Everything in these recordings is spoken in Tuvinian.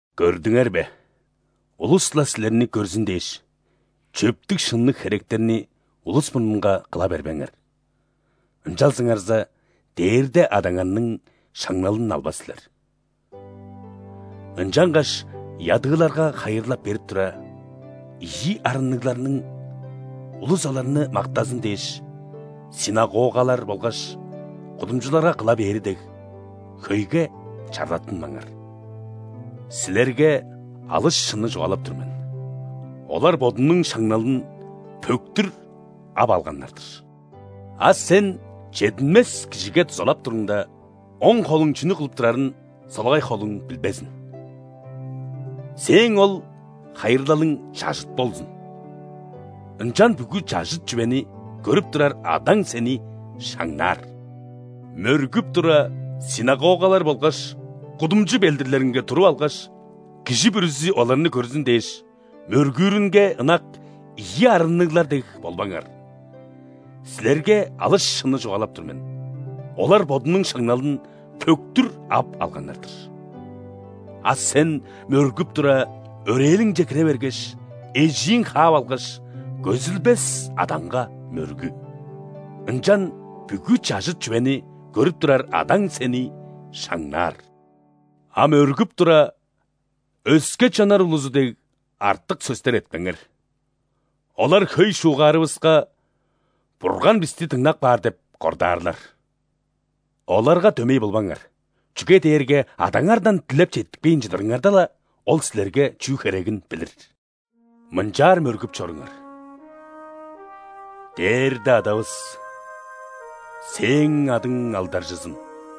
«Көрдүңер бе, улус-ла силерни көрзүн дээш, чөптүг-шынныг херектерни улус мурнунга кыла бербеңер: ынчалзыңарза, Дээрде Адаңарның шаңналын албас силер. Ынчангаш ядыыларга хайырлал берип тура, ийи арынныгларның, улус оларны мактазын дээш, ·синагогалар болгаш кудумчуларга кыла бээри дег, хөйге чарлаттынмаңар. Силерге алыс шынны чугаалап тур мен: олар бодунуң шаңналын пөктүр ап алганнар-дыр. А сен чединмес кижиге дузалап туруңда, оң холуң чүнү кылып турарын солагай холуң билбезин. Сээң ол хайырлалың чажыт болзун. Ынчан бүгү чажыт чүвени көрүп турар Адаң сени шаңнаар». «Мөргүп тура, ·синагогалар болгаш кудумчу белдирлеринге туруп алгаш, кижи бүрүзү оларны көрзүн дээш, мөргүүрүнге ынак ийи арынныглар дег болбаңар. Силерге алыс шынны чугаалап тур мен: олар бодунуң шаңналын пөктүр ап алганнар-дыр. А сен мөргүп тура, өрээлиңче кире бергеш, эжииң хаап алгаш, көзүлбес Адаңга мөргү. Ынчан бүгү чажыт чүвени көрүп турар Адаң сени шаңнаар. А мөргүп тура, өске чоннар улузу дег, артык сөстер этпеңер. Олар хөй шуугаарывыска, Бурган бисти дыңнап каар деп кордаарлар. Оларга дөмей болбаңар, чүге дээрге Адаңардан дилеп четтикпейн чыдырыңарда-ла, Ол силерге чүү херегин билир. Мынчаар мөргүп чоруңар:„Дээрде Адавыс!Сээң адың алдаржызын!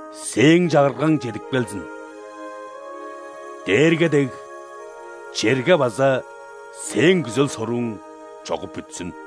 Сээң Чагыргаң чедип келзин.Дээрге дег, черге базаСээң күзел-сорууң чогуп бүтсүн.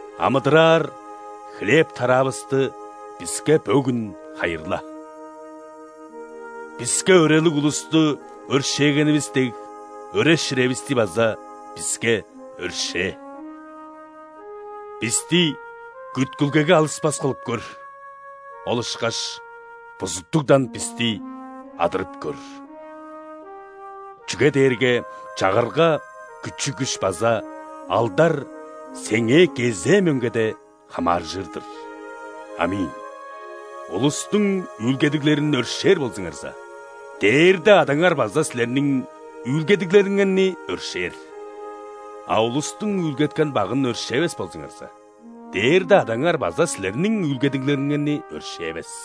Амыдыраар хлеб-тараавыстыбиске бөгүн хайырла. Биске өрелиг улусту өршээгенивис дег,өре-ширевисти база биске өршээ. Бисти күткүлгеге алыспас кылып көр,ол ышкаш бузуттугдан бисти адырып көр.[Чүге дээрге чагырга, күчү-күш база алдарСеңээ кезээ мөңгеде хамааржыр-дыр. Аминь.]“ Улустуң үүлгедиглерин өршээр болзуңарза, Дээрде Адаңар база силерниң үүлгедиглериңерни өршээр. А улустуң үүлгеткен багын өршээвес болзуңарза, Дээрде Адаңар база силерниң үүлгедиглериңерни өршээвес».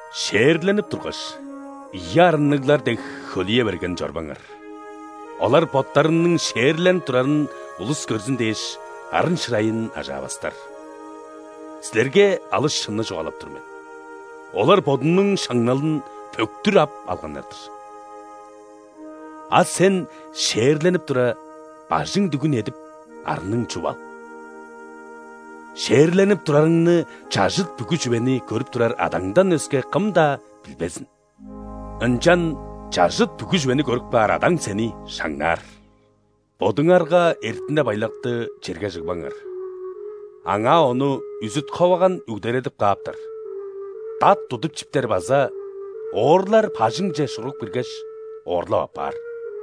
«·Шээрленип тургаш, ийи арынныглар дег, хөлүе берген чорбаңар. Олар боттарының шээрленип турарын улус көрзүн дээш, арын-шырайын ажаавастар. Силерге алыс шынны чугаалап тур мен: олар бодунуң шаңналын пөктүр ап алганнар-дыр. А сен шээрленип тура, бажың дүгүн эдип, арның чуп ал. Шээрленип турарыңны чажыт бүгү чүвени көрүп турар Адаңдан өске кым-даа билбезин. Ынчан чажыт бүгү чүвени көрүп каар Адаң сени шаңнаарR». «Бодуңарга эртине-байлакты черге чыгбаңар, аңаа ону үзүт-ховаган үгдередип кааптар, дат тудуп чиптер база оорлар бажыңче шургуп киргеш, оорлап аппаар.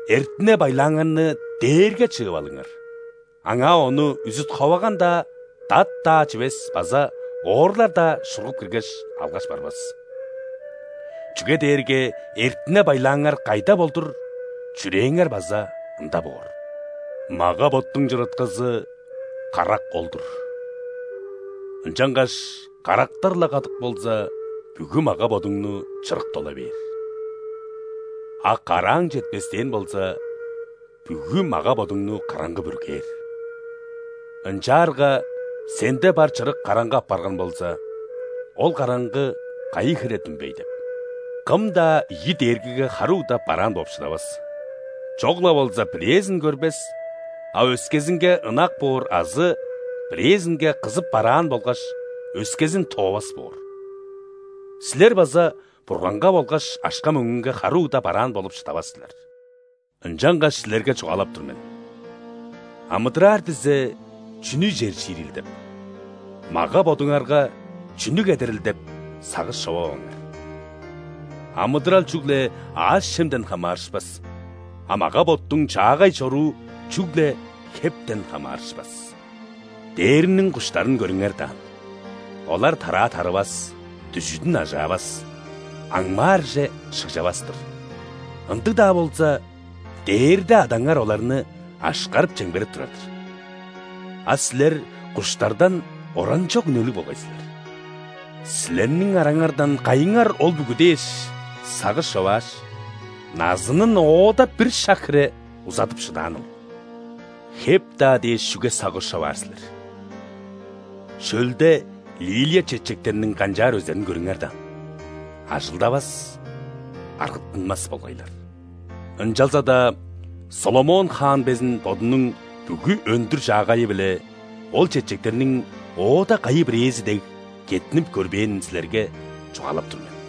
Эртине-байлааңарны дээрге чыып алыңар, аңаа ону үзүт-ховаган-даа, дат-даа чивес база оорлар-даа шургуп киргеш, алгаш барбас. Чүге дээрге эртине-байлааңар кайда болдур, чүрээңер база ында боор. Мага-боттуң чырыткызы – карак ол-дур. Ынчангаш карактар-ла кадык болза, бүгү мага-бодуңну чырык дола бээр. А карааң четпестээн болза, бүгү мага-бодуңну караңгы бүргээр. Ынчаарга, сенде бар чырык караңгы апарган болза, ол караңгы кайы хире дүмбей деп! Кым-даа ийи дээргиге хары угда бараан бооп шыдавас: чок-ла болза бирээзин көрбес, а өскезинге ынак боор азы бирээзинге кызып бараан болгаш, өскезин тоовас боор. Силер база Бурганга болгаш акша-мөңгүнге хары угда бараан болуп шыдавас силер. Ынчангаш силерге чугаалап тур мен: амыдыраар дизе – чүнү ижер-чиирил деп; мага-бодуңарга – чүнү кедерил деп сагыш човаваңар. Амыдырал чүгле аъш-чемден хамаарышпас, а мага-боттуң чаагай чоруу чүгле хептен хамаарышпас. Дээрниң куштарын көрүңер даан: олар тараа тарывас, дүжүдүн ажаавас, аңмаарже шыгжавас-тыр, ындыг-даа болза, Дээрде Адаңар оларны ашкарып-чемгерип турар-дыр. А силер куштардан оранчок үнелиг болгай силер! Силерниң араңардан кайыңар ол бүгү дээш сагыш човааш, назынын оода-ла бир шак хире узадып шыдааныл? Хеп-даа дээш чүге сагыш човаар силер? Шөлде лилия чечектерниң канчаар өзерин көрүңер даан: ажылдавас, аргыттынмас болгайлар. Ынчалза-даа ·Соломон хаан безин бодунуң бүгү өндүр-чаагайы-биле ол чечектерниң оода кайы-бирээзи дег кеттинип көрбээнин силерге чугаалап тур мен.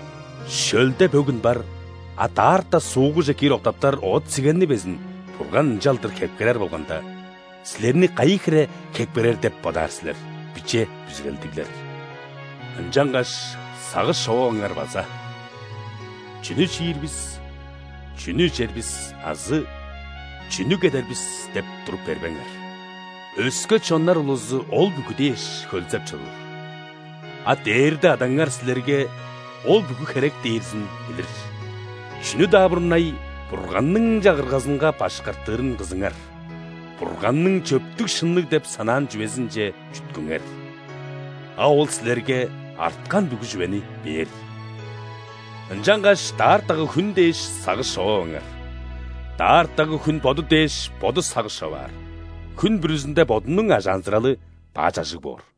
Шөлде бөгүн бар, а даарта суугуже киир октаптар оът-сигенни безин Бурган ынчалдыр хепкерер болганда, силерни кайы хире хепкерер деп бодаар силер, биче бүзүрелдиглер! Ынчангаш сагыш човаваңар база: „Чүнү чиир бис?“, „Чүнү ижер бис?“ азы „Чүнү кедер бис?“ – деп туруп бербеңер. Өске чоннар улузу ол бүгү дээш хөлзеп чоруур. А Дээрде Адаңар силерге ол бүгү херек дээрзин билир. Чүнү-даа мурнай Бурганның Чагыргазынга башкартырын кызыңар, Бурганның чөптүг-шынныг деп санаан чүвезинче чүткүңер. А Ол силерге арткан бүгү чүвени бээр. Ынчангаш даартагы хүн дээш сагыш човаваңар. Даартагы хүн боду дээш боду сагыш човаар: хүн бүрүзүнде бодунуң ажаанзыралы баш ажыг боор».